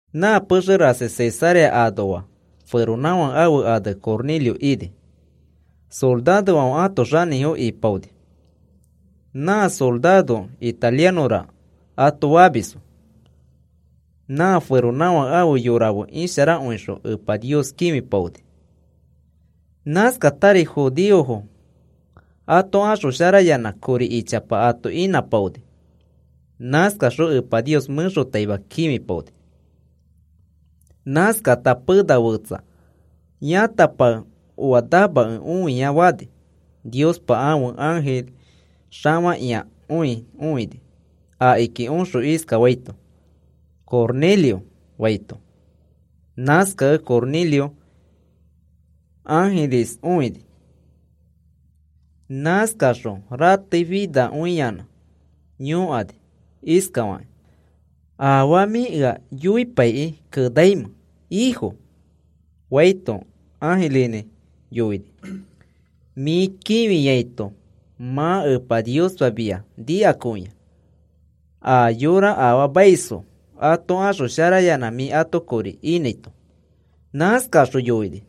Nã pexe rasi Cesarea anoa feronãfake ãfe ane Cornelio ini. Sorarofãfe ãto xanĩfo ipaoni. Nã sorarofo, “Italianõra,” ato famisfo. Nã feronãfake ãfe yorafo fe isharakõixõ Epa Nios kĩfipaonifo. Nãskatari judeofo ato axosharayanã kori ichapa ato inãpaoni. Nãskaxõ Epa Nios mẽxotaima kĩfipaoni. Nãskata pena fetsa yãtapake oa namakẽ õia fani, Niospa ãfe ãjiri xafakĩakõi õini akiki oxõ iskafaito: “Cornelio,” faito. Nãskakẽ Cornelio ãjiris õini. Nãskaxõ rateifinakõiyanã yõkani iskafakĩ: “¿Afaa mĩ ea yoipaikĩ kenaimẽ, Ifo?” faito, ãjirinĩ yoini: “Mĩ kĩfiaito mã Epa Niospa mia nikakõia, a yora afaamaisfo ato axosharayanã mĩ ato kori inãito.” Nãskaxõ yoini: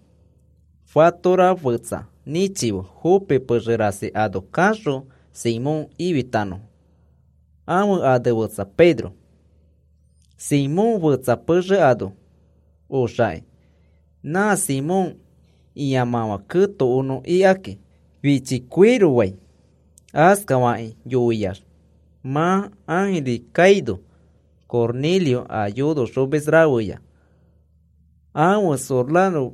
“Fatora fetsa nĩchife Jope pexe rasi ano kaxõ Simón ifitanõfo. Ãfe ane fetsa Pedro. Simón fetsa pexe ano oxaki nã Simón ĩamãfã ketokonõ ikaki fichi koiro fai.” Askafakĩ yoiax mã ãjiri kaino, Cornelio a yonoxomis rafeya ãfe soraro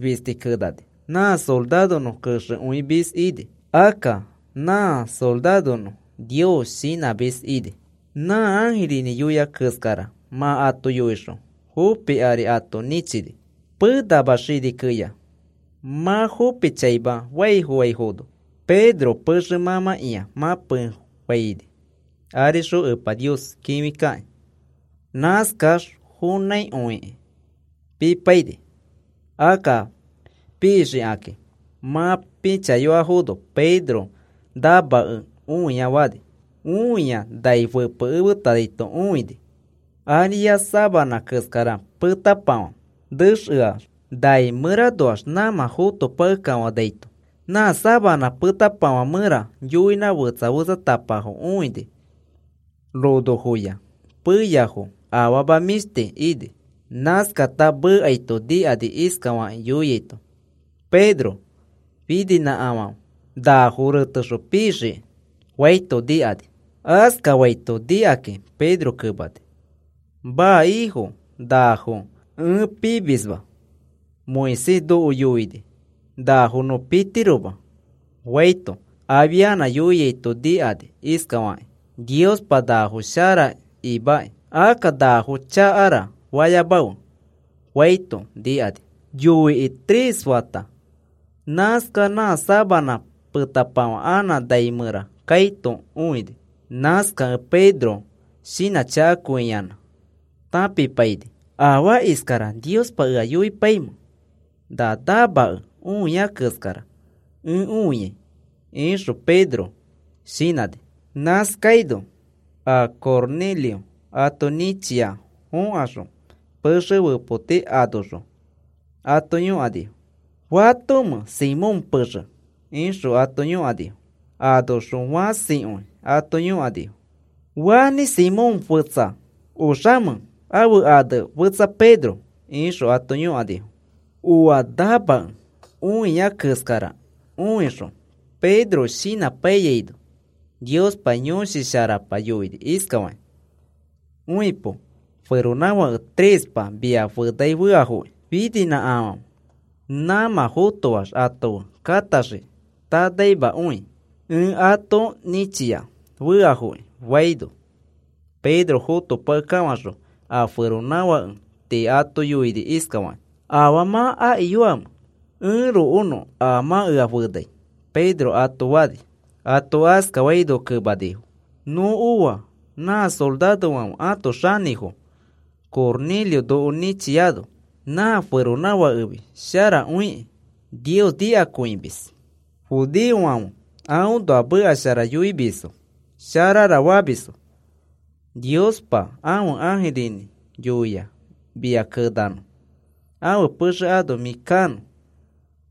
fisti kenani nã soraronõ kexekõimis ini. Akka nã soraronõ Nios shinãmis ini. Nã ãjirinĩ yoia keskara mã ato yoixõ Jope ari ato nĩchini. Penama xini keya mã Jope chaima faifoaifono, Pedro pexe mãmãkĩa mãpeinĩfofãni arixõ Epa Nios kĩfikakĩ. Nãskax fonãikõikĩ pipaini. Akka pixikakĩ mã pĩchaifono Pedro namakẽ õia fani. Õia nai fepekemeaito õini ariax sabanã keskara petapafã nexeax nai mẽranoax nãmã fotopakekafanaito. Nã sabanã petapafã mẽra yoinã fetsa fetsatapafo õini ronofoya, peyafo, afama mĩshti ini. Nãskata mekaito nikani iskafakĩ yoiaito: “Pedro, fininãkafãfe. Nafo retexõ pixiki,” faito nikani. Askafaito nikakĩ Pedro kemani: “Maa, Ifo, nafo ẽ pimisma, Moisés noko yoini nafo nõ pitiroma,” faito, afianã yoiaito nikani iskafakĩ: “Niospa nafo shara imaki. Akka nafo chakara fayamafe,” faito nikani. Yoikĩ tres fata nãskax nã sabanã petapafã anã nai mẽra kaito õini. Nãskakẽ Pedro shinãchakakõiyanã tãpipaini. “¿Afaa iskara Niospa ea yoipaimẽ na namakẽ õia keskara ẽ õiai?” ixõ Pedro shinãni. Nãskaino a Cornelio ato nĩchia fokaxõ, pexe fepoti anoxõ ato yõkanifo: “¿Fatomẽ Simón pexe?” ixõ ato yõkanifo. Anoxõ fãsikõi ato yõkanifo: “¿Fanĩ Simón fetsa oxamẽ, ãfe ane fetsa Pedro?” ixõ ato yõkanifo. Oa namakẽ õia keskara õixõ Pedro shinãpaiyaino, Niospa Yõshi Sharapa yoini iskafakĩ: “Õipo, feronãfake trespa mia fenai feafokĩ. Fininãkafãfe. Nã mã fotoax ato fe kataxiki tanaimakõi, ẽ ato nĩchia feafoki,” faino, Pedro fotopakekafãxõ a feronãfake tii ato yoini iskafakĩ: “¿Afaa mã akiyoamẽ? Ẽrokonõ a mã ea fenai,” Pedro ato fani. Ato askafaino kemanifo: “Nõ oa nã sorarofãfe ãto xanĩfo Cornelio noko nĩchiano nã feronãfakefi sharakõiki. Nios nikakõimis. Judeofãfe aõnoa meka shara yoimisfo sharara famisfo, Niospa ãfe ãjirinĩ yoia mia kenanõ ãfe pexe ano mĩ kanõ,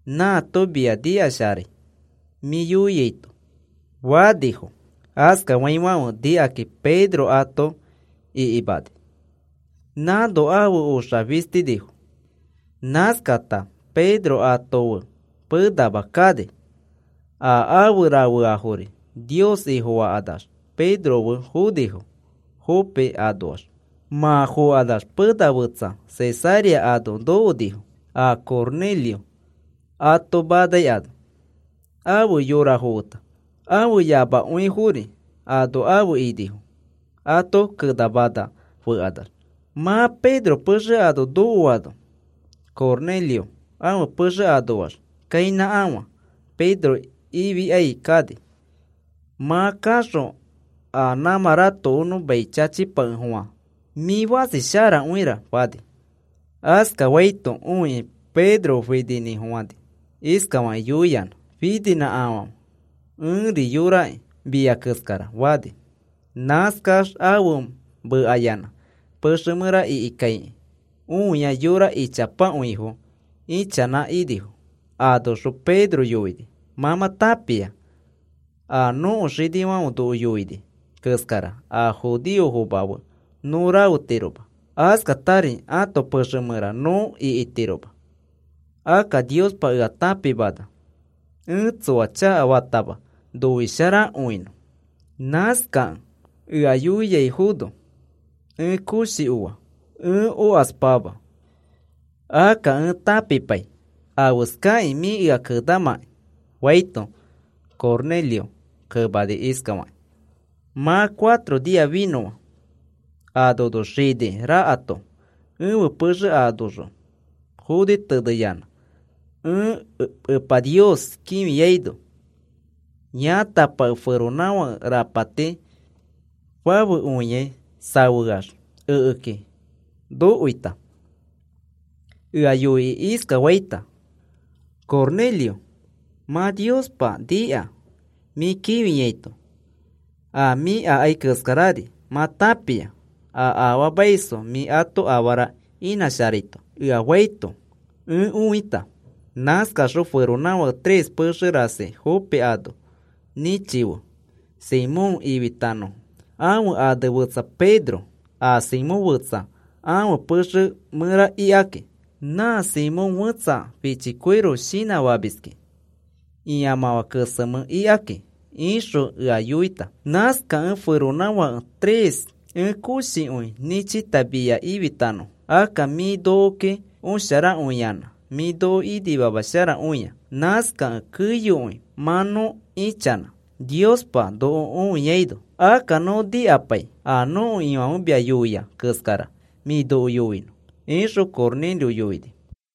nãato mia nikasharai mĩ yoiaito,” fanifo. Askafaifãfe nikakĩ Pedro ato ikimani. Nãno afe oxa fistinifo, nãskata Pedro ato fe penama kani. A afe rafeafori Nios Ifofakanax Pedro fe fonifo Jope anoax. Mã fokanax pena fetsa Cesarea ano nokonifo, a Cornelio ato manai ano, afe yorafo feta. Ãfe yamakõifori ano afe inifo ato kenamana fekanax. Mã Pedro pexe ano nokoano, Cornelio ãfe pexe anoax kãinãkafã Pedro ifikai kani. Mã kaxõ a nãmã ratokonõ mai chachipakefofã: “Mĩ fãsi sharakõira,” fani. Askafaito õikĩ Pedro fininĩfofãni iskafakĩ yoiyanã: “Fininãkafãfe. Ẽri yoraki mia keskara,” fani. Nãskax afe mekayanã pexe mẽra ikikaikĩ õia yora ichapakõifo ichanã inifo. Anoxõ Pedro yoini: “Mã mã tãpia a nõko xinifãfe noko yoini keskara a judeofoma fe nõ rafetiroma. Askatari ãto pexe mẽra nõ ikitiroma. Akka Niospa ea tãpimana ẽ tsoa chakafatama ẽ ato noisharakõinõ. Nãskakẽ ea yoiaifono ẽ koshi oa, ẽ okaspama. Akka ẽ tãpipai afeskakĩ mĩ ea kenamãki,” faito, Cornelio kemani iskafakĩ: “Mã cuatro nia finõa, a nono xini rakato ẽfe pexe anoxõ foni teneyanã ẽ Epa Nios kĩfiaino yãtapake, feronãfake rapati fafekõiai safeax ekeki nokoita, ea yoikĩ iskafaita: ‘Cornelio, mã Niospa nika mĩ kĩfiaito. A mĩ akai keskarari mã tãpia, a afaamaisfo mĩ ato afara inãsharaito,’ ea faito ẽ õita. ‘Nãskaxõ feronãfake tres pexe rasi Jope ano nĩchife Simón ifitanõfo. Ãfe ane fetsa Pedro. A Simón fetsa ãfe pexe mẽra ikaki. Nã Simón fẽtsa fichi koiro shinã famiski ĩamãfã kesemẽ ikaki,’ ixõ ea yoita. Nãskakẽ feronãfake tres ẽ koshikõi nĩchita mia ififonõfo. Akka mĩ nokoki osharakõiyanã mĩ noko inimamasharakõia. Nãskakẽ keyokõi mã nõ ichanã Niospa noko õiaino. Akka nõ nikapai a nõko Ifãfe mia yoia keskara mĩ noko yoinõ,” ixõ Cornelio yoini.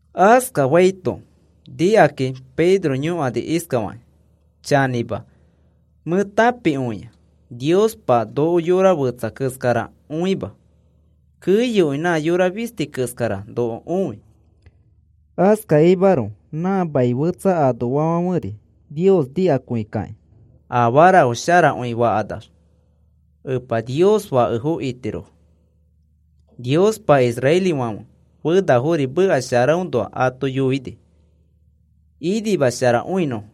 Askafaito nikakĩ Pedro yoini iskafakĩ: “Chanĩma mẽ tãpikõia Niospa noko yora fetsa keskara õima, keyokõi nã yora fisti keskara noko õi. Askakimaroko nã mani fetsafãferi Nios nikakõikakĩ, afarafo sharakõi fakanax, Epa Niospa fake itirofo. Niospa israelifãfe fenafo meka sharaõnoa ato yoini, inimasharakõinõfo.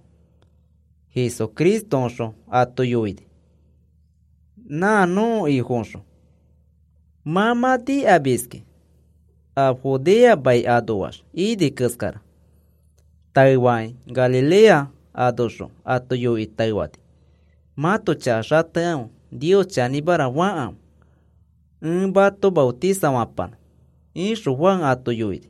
Jesucristoõxõ ato yoini, nã nõko Ifoõxõ. Mã mã nikamiski a Judea mai anoax ini keskara. Taefakĩ Galilea anoxõ ato yoikĩ taefani: ‘Mãto chaka xatekãfe Nios chanĩmara fakãfe ẽ mato maotisafapanõ,’ ixõ Juan ato yoini.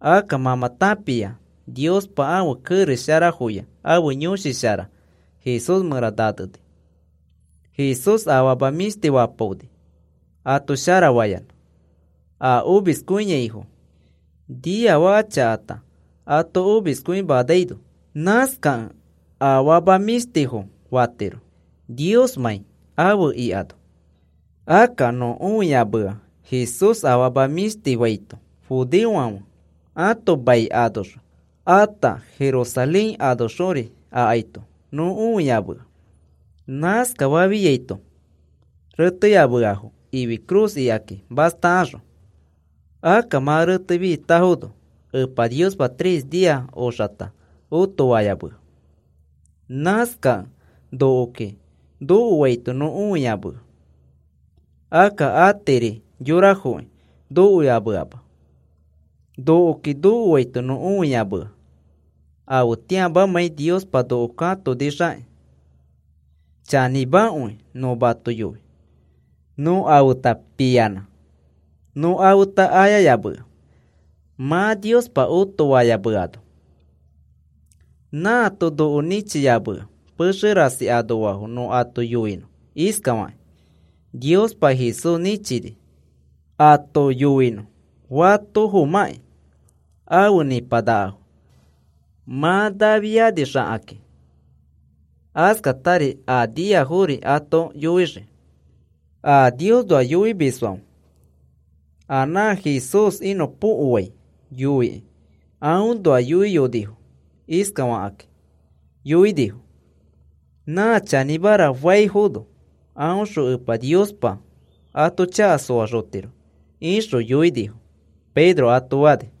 Akka mã mã tãpia Niospa ãfe kerex sharafoya ãfe Yõshi Shara Jesús mẽra naneni. Jesús afama mĩshtifo fapaoni, ato sharafayanã a omiskõiaifo, niafaka chakata ato omiskõimanaino. Nãskakẽ afama mĩshtifo fatiro Niosmãi afe ikano. Akka nõ õiyamea Jesús afama mĩshtifo faito judeofãfe ãto mai anoxõ ata Jerusalén anoxori akaito nõ õiyamea. Nãskafafiaito reteyameafo ifi cruz ikakĩ mastakaxõ. Akka mã retefitafono Epa Niospa tres nia oxata otofayamea. Nãskakẽ nokoki nokoaito nõ õiyamea. Akka atiri yorafoki nokoyameama, nokoki nokoaito nõ õiyamea. Afetĩamamãi Niospa noko katonixakĩ chanĩmakõi nõ mato yoi. Nõ a feta piyanã nõ afeta ayayamea mã Niospa otofayameano. Nãato noko nĩchiyamea pexe rasi anoafo nõ ato yoinõ iskafaki: ‘Niospa Jesús nĩchini,’ ato yoinõ fatofomãkĩ afe nĩpanakafo mã nafianixakakĩ, askatari a niafori ato yoixii. A Niosnoa yoimisfãfe a nã Jesús iskanõpokoai yoikĩ aõnoa yoiyonifo. Iskafakakĩ yoinifo: ‘Nã chanĩmara faifono aõxõ Epa Niospa ato chaka soaxotiro,’ ixõ yoinifo,” Pedro ato fani.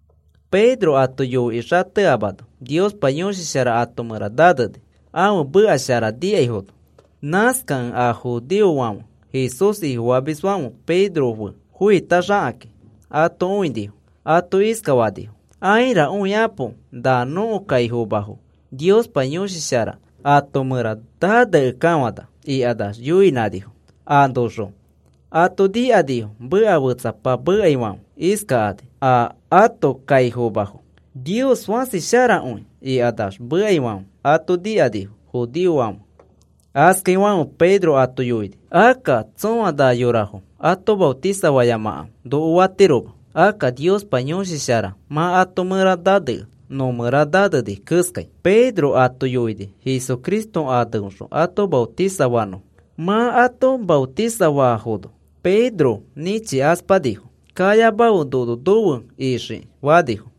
Pedro ato yoikĩ xateamano Niospa Yõshi Shara ato mẽra naneni ãfe meka shara nikaifono. Nãskakẽ a judeofãfe Jesús Ifofamisfãfe Pedro fe foitaxakakĩ ato õinifo. Ato iskafanifo: “Aira. Õikapo. Na nõko kaifomafo Niospa Yõshi Shara ato mẽra naneakekafana,” ikax yoinãnifo. Anoxõ ato nikanifo meka fetsapa mekaifãfe iskakani a ato kaifomafo: “Nios fãsi sharakõi,” ikanax mekaifãfe ato nikanifo judeofãfe. Askaifãfe Pedro ato yoini: “Akka tsõa na yorafo ato maotisano fayamakãfe noko fatirofoma. Akka Niospa Yõshi Shara mã ato mẽra nanea, nõmẽra naneni keskai.” Pedro ato yoini Jesucristo aneõxõ ato maotisano fanõfo. Mã ato maotisano faafono, Pedro nĩchikaspanifo. “Kayamafe, nono nofe iyoxiki,” fanifo.